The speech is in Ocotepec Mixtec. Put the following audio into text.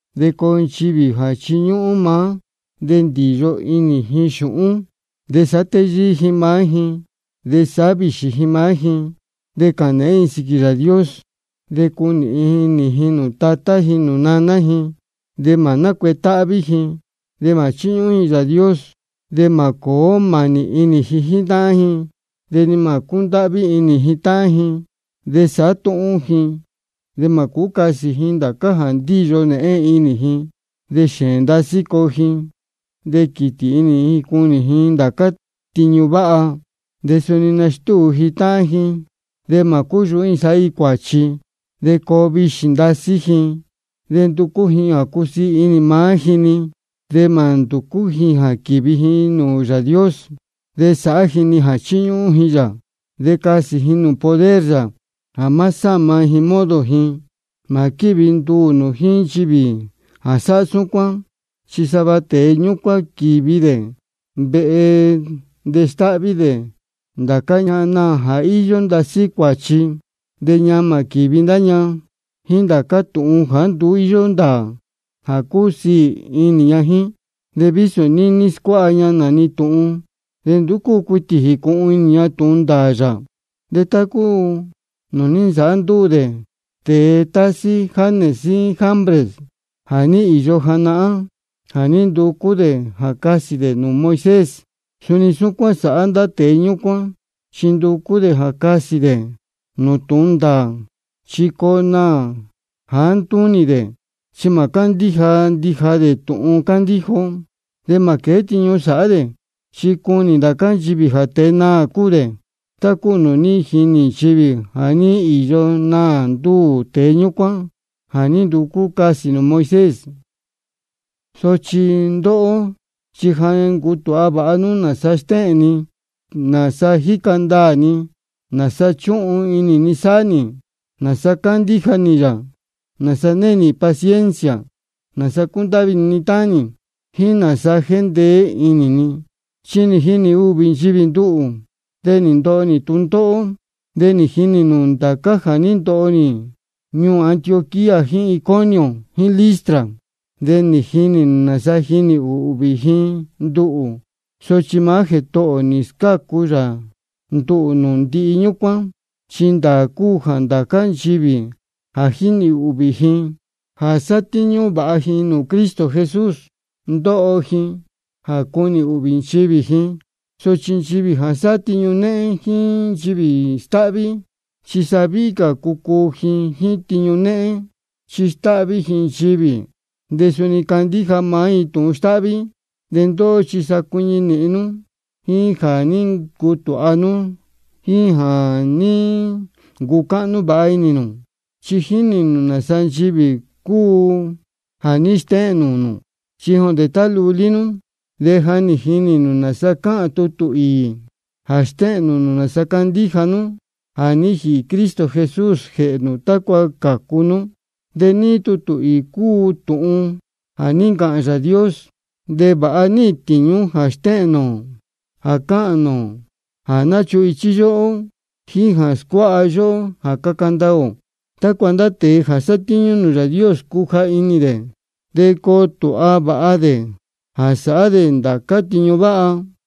Chi coo nchivī jā chiñúhún maá, de ndīyo inī ji xūhún, de sāhá téyíí ji maá ji, de sāhá vīxī ji maá ji. De cāhān nēhén ji sīquī Yāā Dios, de cunīhin inī ji nūū tatá ji nūū naná ji, de mā nácuetáhví ji, de mā chíñúhún ji Yāā Dios. De mā cōó mānī ji jíín táhán ji de ni mā cúndáhví inī ji. De sāhá túhún ji, de mā cūú casī ji ndācá jā ndíyo nēhén inī ji, de xēēn ndasí coo ji, de quītī inī ji cunī ji ndācá tiñu váha. De suni nastúu ji táhán ji, de mā cúyūhú ji sāhá ji cuāchi, de coo vīxī ndasí ji, de nducú ji jā cusiī inī maá ji-ni, de mā nducú ji jā quīvi ji nūū Yāā Dios. De sāhá ji-ni jā chiñúhún ji yā, de casī ji nūū poder yā jā má sáma ji modo ji. Mā quívi nduū nū jíín nchivī jā sáhá súcuán. Chi sava tēe ñúcuán quīvi dē vehe de stáhví dē ndācá ñahan naā jā íyó ndasí cuāchi. De ñamā quīvi ndá ña jíín ndācá tūhun jāá nduú íyó ndāā jā cúsiī inī ña jíín. De vísō níní scuáha ña nā-ni tūhun, de nduú cúu cuitī jīcūhun inī ña tūhun ndāā yā. De tá cúu nūū ní nsāhá ndúū tēe tásí Janes jíín Jambres jā ní īyo janahán, jā ní nducú dē jā casī dē nūū Moisés, suni súcuán sāhá ndá tēe ñúcuán, chi nducú dē jā casī dē nūū tūhun ndāā. Chi coo naā jāá ntúnī ndá dē, chi mā cándíja ndija dē tūhun cándíja ó. De mā quēé tiñu sāhá dē, chi cunī ndācá nchivī jā tēe naā cúu dē, tá cúu nūū ní jinī nchivī jā ní īyo naā ndúū tēe ñúcuán jā ní nducú casī nūū Moisés. Sochi ndóhó chi ja nī ncutūha vāha nú nāsa stéhēn ni, nāsa jíca ndaā ni, nāsa chúhun inī ni sāhá nī, nāsa cándíja nī yā, nāsa née nī paciencia, nāsa cúndáhví inī ni táhán nī, jíín nāsa jéndeé inī ni. Chi nī jinī ūhvī nchivī nduhū, de nī ndoho nī tūndóhó. De jínī nū ndācá jā ní ndoho nī ñuū Antioquía jíín Iconio jíín Listra. De jínī nū nāsa nī jinī ūhvī ji nduhū. Sochi maá Jētohō ō nī scácu yā nduhū nūū ndihi ñúcuán. Chi ndāā cúu jā ndācá nchivī jā ndíhvī inī ji jā sátíñú vāha ji nūū Cristo Jesús, ndoho ji jā cunī ūhvī nchivī ji. Sochi nchivī jā sáhá tiñu néhén jíín nchivī stáhví, chi sa víhí cā cucuu ji jíín tiñu néhén, chi stáhví ji nchivī de suni candíja maá ji tūhun stáhví. De ndóhó chi sa cuiñi nīhin nú jíín jā ní ncutūha nú jíín jā ní ncucáhnú vāha inī nū. Chi jínī nū nāsa nchivī cúu jā ní stéhēn nūū nū. Chi jondē tá lulí nú, de ja jínī nū nāsa cáhān tutū īī jā stéhēn nūū nū nāsa candíja nú jā ní jīhī Cristo Jesús jēhē nū tácua cācu nú. De níí tutū īī cúu tūhun jā ní ncāhān Yāā Dios, de vāha níhīn tīñú jā stéhēn nūū ō, jā cáhān nūū ō, jā náchuhun ichí yóhó, jíín jā scuáha yóhó jā caca ndaā ō, tácua ndá tēe jā sátíñú nūū Yāā Dios, cuja inī dē de coo tūha vāha dē jā sāhá dē ndācá tiñu váha.